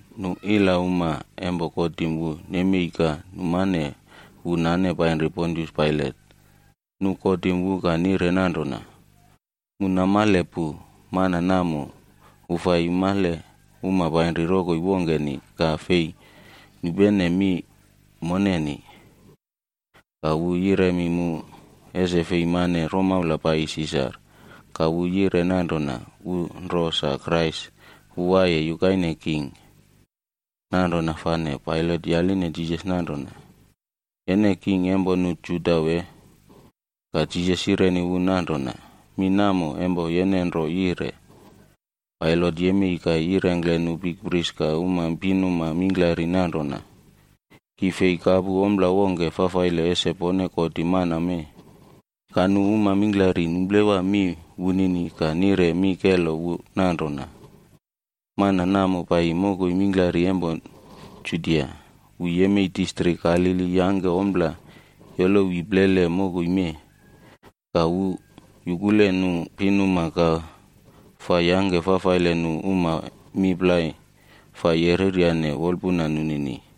Nu ilauma empo kotim wu nemei ka numane wu nane painri Pontius Pailat. Nu kotim wu ka nire nanrona, “Mu namale pu mana namo wu fai yumale uma painri rokoi wongkeni ka fei nupene mi moneni. Ka wu yiremi mu ese fei mane romaula paiyi Sisar.a Ka wu yire nanrona wu nro sa Krais wu waiye yukaine king.” Nanrona fane Pailat yaline Jisas nanrona, “Yene king empo nu Juda wee?” Ka Jisas yireni wu nanrona, “Mi namo empo yene nro yire.” Pailat yemei ka yirengkle nu bikpris ka uma pinuma mingklari nanrona, “Ki fei kapu ompla wongke fafaile ese pone kotim mana mee.” Ka uma mingklari numplewa mi wunini ka nire mi kelo wu nanrona, “Mana namo paiyi mokoi mingklari empo Judia. Wu yemei distrik Galili yangke ompla yolowi plele mokoi mee. Ka wu yukule nu pinuma ka fa yangke fafaile nu uma mi plai fa yereryane wolpuna nunini.”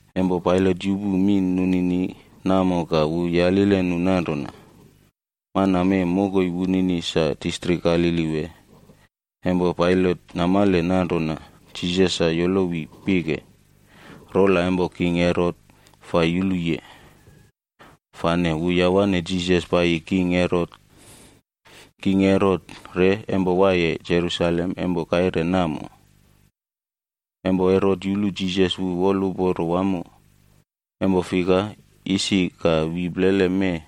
Empo Pailat yupu mi nunini namo ka wu yalile nu nanrona, “Mana mee mokoi wunini sa distrik Galili wee?” Empo Pailat namale nanrona Jisas sa yolowi pike rola empo king Herot fa yuluye, fane wu yawane Jisas paiyi king Herot. King Herot re empo waiye Jerusalem empo kaire namo. Empo Herot yulu Jisas wu woluporo wamo, empo fika, isi ka wi plele mee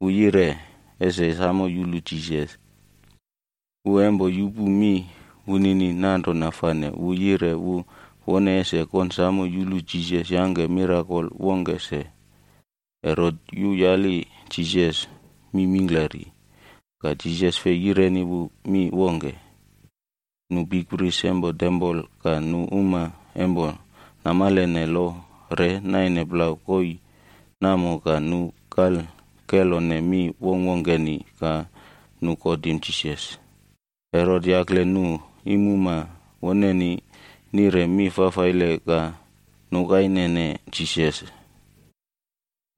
wu yire ese samo yulu Jisas. Wu empo yupu mi wunini nanrona fane wu yire wu wone ese konsamo yulu Jisas yangke mirakol wongke se. Herot yuyali Jisas mi mingklari, ka Jisas fei yireni wu mi wongke. Nu bikpris empo tempol ka nu uma empo namalene lo re naine plau koii namo ka nu kal kelone mi wongkwongkeni ka nu kotim Jisas. Herot yakle nu iimuma woneni nire mi fafaile ka nukainene Jisas.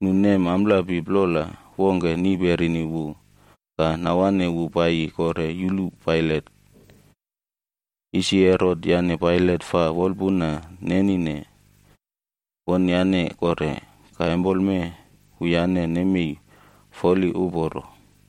Nu nem amplapi plola wongke niperini wub ka nawane wu paiyi kore yulu Pailat. Isi Herot yane Pailat fa wolpuna nenine wonyane kore, ka empoleme, wuyane nemei foli uporo.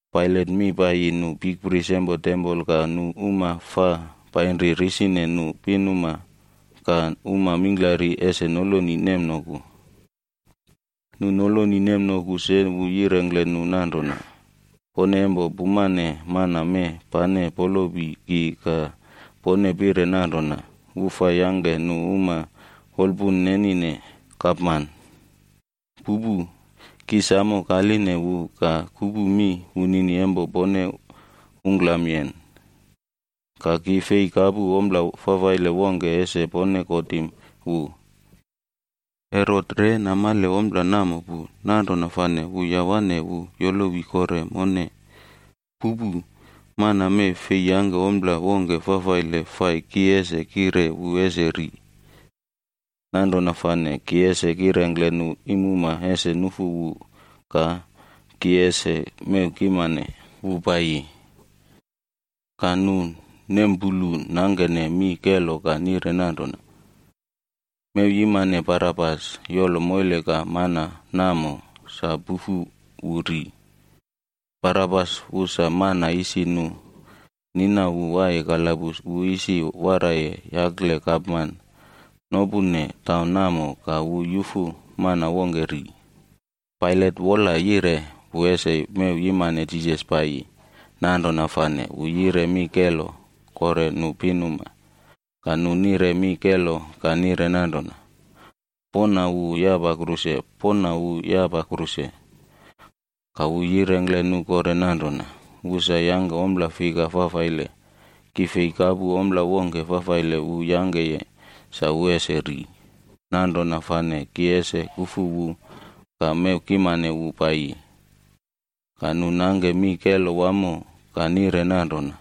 Pailat mi paiyi nu bikpris empo tempol ka nu uma fa painri risine nu pinuma ka uma mingklari ese noloni nemnoku. Nu noloni nemnoku se wu yirengkle nu nanrona, “Pone empo pumane mana mee pane polopi ki ka pone pire nanrona wu fa yangke nu uma wolpun nenine gapman. Pupu! Ki samo kaline wu ka kupu mi wunini empo pone ungklamyen, ka ki fei kapu ompla fafaile wongke ese pone kotim wu. Herot re namale ompla namo pu, nanrona fane wu yawane wu yolowi kore mone. Pupu. Mana mee fei yangke ompla wongke fafaile fai ki ese kire wu ese ri. Nanrona fane ki ese kirengkle nu iimuma ese nufu wu ka ki ese mew kimane wu paiyi.”c Ka nu nempulu nangkene mi kelo ka nire nanrona, “Mew yimane Barabas yolo moile ka mana namo, sa pufu wu ri!” Barabas wu sa mana isi nu nina wu waiye kalabus wu isi waraiye yakle gapman nopune taun namo ka wu yufu mana wongke ri. Pailat wola yire wu ese mew yimane Jisas paiyi, nanrona fane wu yire mi kelo kore nu pinuma. Ka nu nire mi kelo ka nire nanrona, “Poꞌna wu yapa kruse! Poꞌna wu yapa kruse!” Ka wu yirengkle nu kore nanrona, “Wu sa empo isi yangke ompla fika fafaile? Ki fei kapu ompla wongke fafaile wu yangkeye sa wu ese ri. Nanrona fane ki ese kufu wu ka mew kimane wu paiyi.” Ka nu nangke mi kelo wamo ka nire nanrona,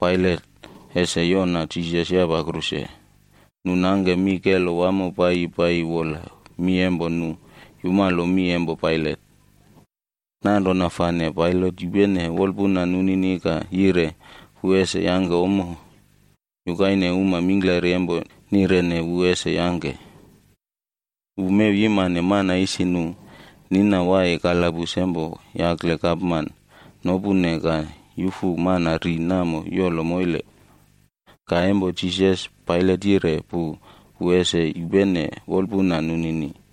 Pailat ese yoꞌna Jisas yapa kruse. Nu nangke mi kelo wamo paiyi paiyi wola mi empo nu yumalo mi empo Pailat. Nanrona fane Pailat yupene wolpuna nunini ka yire wu ese yangke ommo yukaine uma mingklari empo nirene wu ese yangke. Wu mew yimane mana isi nu nina waiye kalabus empo yakle gapman nopune ka yufu mana ri namo yolo moile. Ka empo Jisas, Pailat yire pu wu ese yupene wolpuna nunini.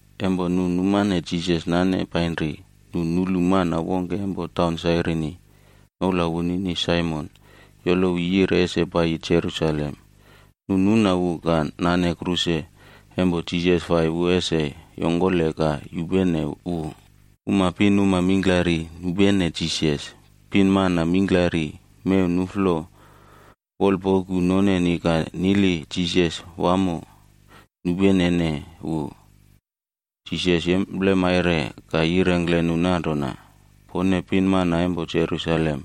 Empo nu numane Jisas nane painrine, nu nulu mana wongke empo taun Sairini, noula wunini Saimon yolowi yire ese paiyi Jerusalem. Nu nuna wu ka nane kruse empo Jisas fai wu ese yongkole ka yupene wu. Uma pinuma mingklari nupene Jisas. Pinmana mingklari mew nuꞌflo wolpoku noneni ka nili Jisas wamo, nupenene wu. Jisas yemplemaire ka yirengkle nu nanrona, “Pone pinmana empo Jerusalem,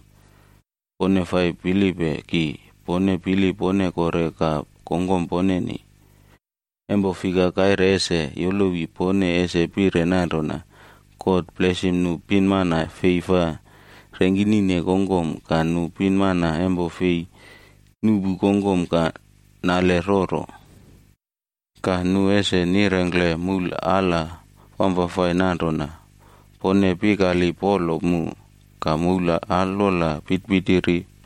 pone fa pilipe ki, pone pili pone kore ka kongkom poneni. Empo fika, kaire ese yolowi pone ese pire nanrona, ‘God blesim nu pinmana fei fa rengkinine kongkom ka nu pinmana empo fei nuꞌpu kongkom ka nale roro.’ ‘Ka nu ese nirengkle moul ala wamfafai nanrona: “Pone pikali polo mu!” Ka moul alwola pitipitiri: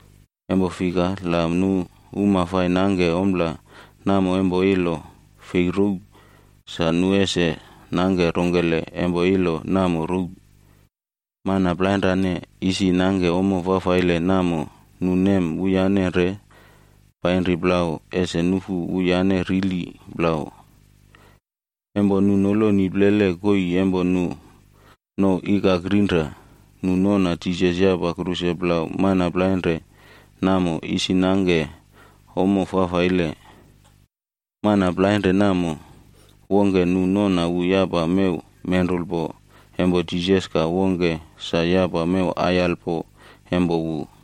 Empo fika, la nu uma fai nangke ompla namo empo ilo fei row,e sa nu ese nangke rongkele empo ilo namo row?” Mana plainrane isi nangke ommo fafaile namo nu nem wuyane re painri plau ese nufu wuyane rili plau. Empo nu noloni plele koii empo nu nouw Ikak Rinra, nu nona Jisas yapa kruse plau mana plainre namo isi nangke ommo fafaile. Mana plainre namo, wongke nu nona wu yapa mew menrulpo empo Jisas ka wongke sa yapa mew aiyalpo empo wu.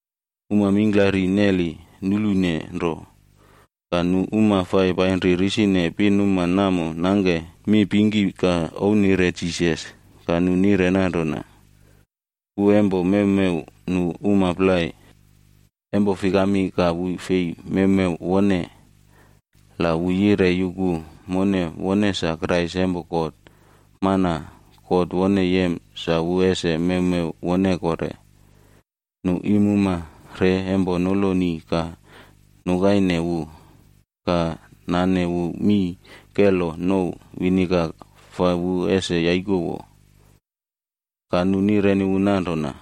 Uma mingklari neli nulune nro, ka nu uma fa painri risine pinuma namo nangke mipingki ka ouwnire Jisas. Ka nu nire nanrona, “Wu empo mewmew nu uma plai. Empo fikami, ka wu fei mewmew wone. La wu yire yuku mone wone sa Krais empo God, mana God wone yem sa wu ese mewmew wone kore.” Nu iimuma re empo noloni ka ouwnire wu, ka nane wu mii kelo nouw viniga fa wu ese yaikowo. Ka nu nireni wu nanrona,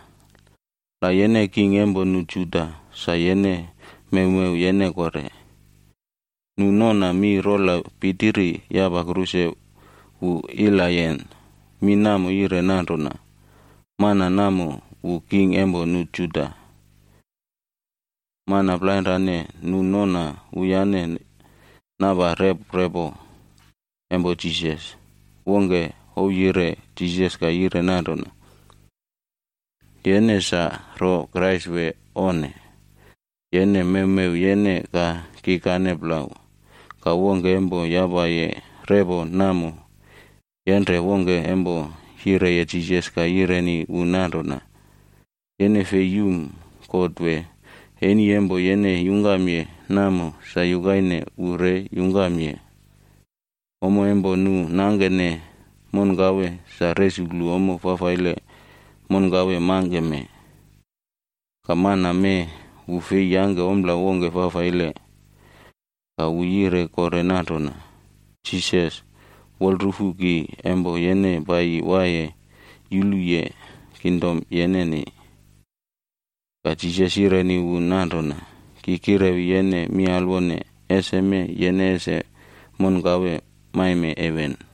“La yene king empo nu Juda, sa yene mewmew yene kore.” Nu nona mi rola pitiri yapa kruse wu ilayen. Mi namo yire nanrona: MANA NAMO WU KING EMPO NU JUDA. Mana plainrane nu nona wuyane napa rep repo empo Jisas, wongke ouwyire Jisas ka yire nanrona, “Yene sa ro Krais wee onne? Yene mewmew yene ka kikane plau!” Ka wongke empo yapaye repo namo, yenre wongke empo yireye Jisas ka yireni wu nanrona, “Yene fei yum God wee? Eni empo yene yungkamye namo, sa yukaine wu re yungkamye. Ommo empo nu nangkene monkawe, sa resuklu ommo fafaile monkawe mangkeme. Ka mana mee wu fei yangke ompla wongke fafaile.” Ka wu yire kore nanrona, “Jisas, wolrufu ki empo yene paiyi waiye yuluye kingdom yeneni.” Ka Jisas yireni wu nanrona, “Ki kirewi yene mi alwone, eseme yene ese monkawe maime heven.”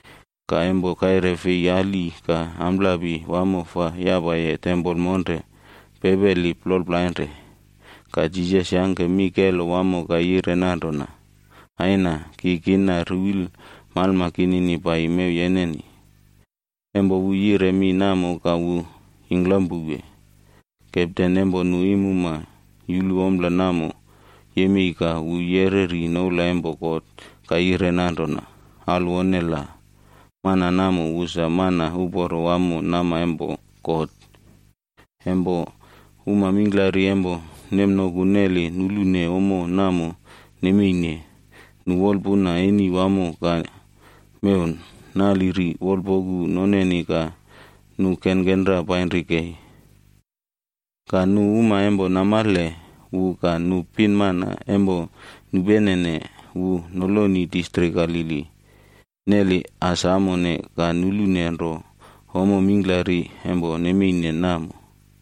Ka empo kaire fei ali ka amplapi wamo fa yapaye tempol monre pepeli plol plainre. Ka Jisas yangke mi kelo wamo ka yire nanrona, “Aina, ki kina ruwil malma kinini paiyi mew yeneni.f Empo wu yire mi namo ka wu yingklam powe. Kepten empo nu iimumag yulu ompla namo yemei ka wu yereri noula empo God ka yire nanrona, “Alwone la, mana namo wu sa mana uporo wamo nama empo God.” Empo uma mingklari empo nemnoku neli nulune ommo namo nemeine, nu wolpuna eni wamo ka mew naliri wolpoku noneni ka nu kenkenra painri kei. Ka nu uma empo namale wu ka nu pinmana empo nupenene wu noloni distrik Galili neli as amone ka nulune nro ommo mingklari empo nemeine namo.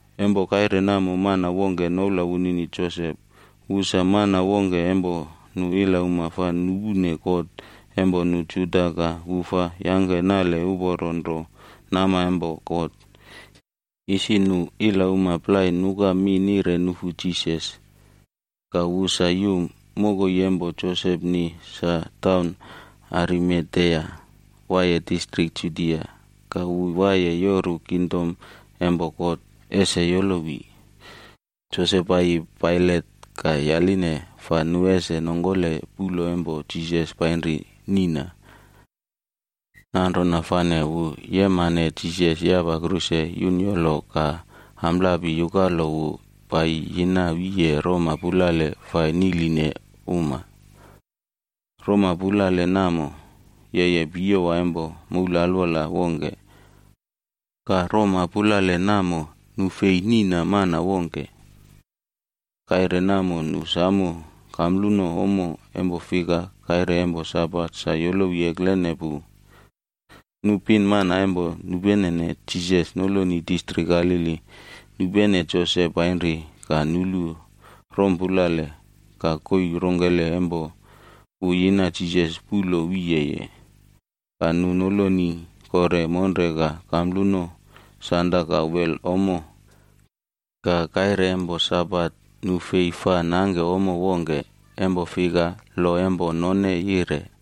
Empo kaire namo mana wongke noula wunini Josep, wu sa mana wongke empo nu ilauma fa nupune kot empo nu Juda ka wu fa yangke nale uporo nro nama empo God. Isi nu ilauma plai nuka mi nire nufu Jisas, ka wu sa yum. Mokoi empo Josepni sa taun Arimatea, waiye distrik Judia. Ka wu waiye yoru kingdom empo God ese yolowi. Josep paiyi Pailat ka yaline fa nu ese nongkole puꞌlo empo Jisas painri niꞌna. Nanrona fane wu yemane Jisas empo yapaye kruse yunyolo ka amplapi yukalo wu paiyi yina wiye roma pulale fa niꞌline uma. Roma pulale namo, yeye piyowa empo moul alwola wongke. Ka roma pulale namo, nu fei niꞌna mana wongke. Kaire namo nu samo kampluno ommo, empo fika, kaire empo Sabat sa yolowi eklene pu. Nu pinmana empo nupenene Jisas noloni distrik Galili nupene Josep painri ka nulu roma pulale, ka koii rongkele empo wu yina Jisas puꞌlo wiyeye. Ka nu noloni kore monre ka kampluno sanda ka wel ommo. Ka kaire empo Sabat, nu fei fa nangke ommo wongke. Empo fika lo empo none yire.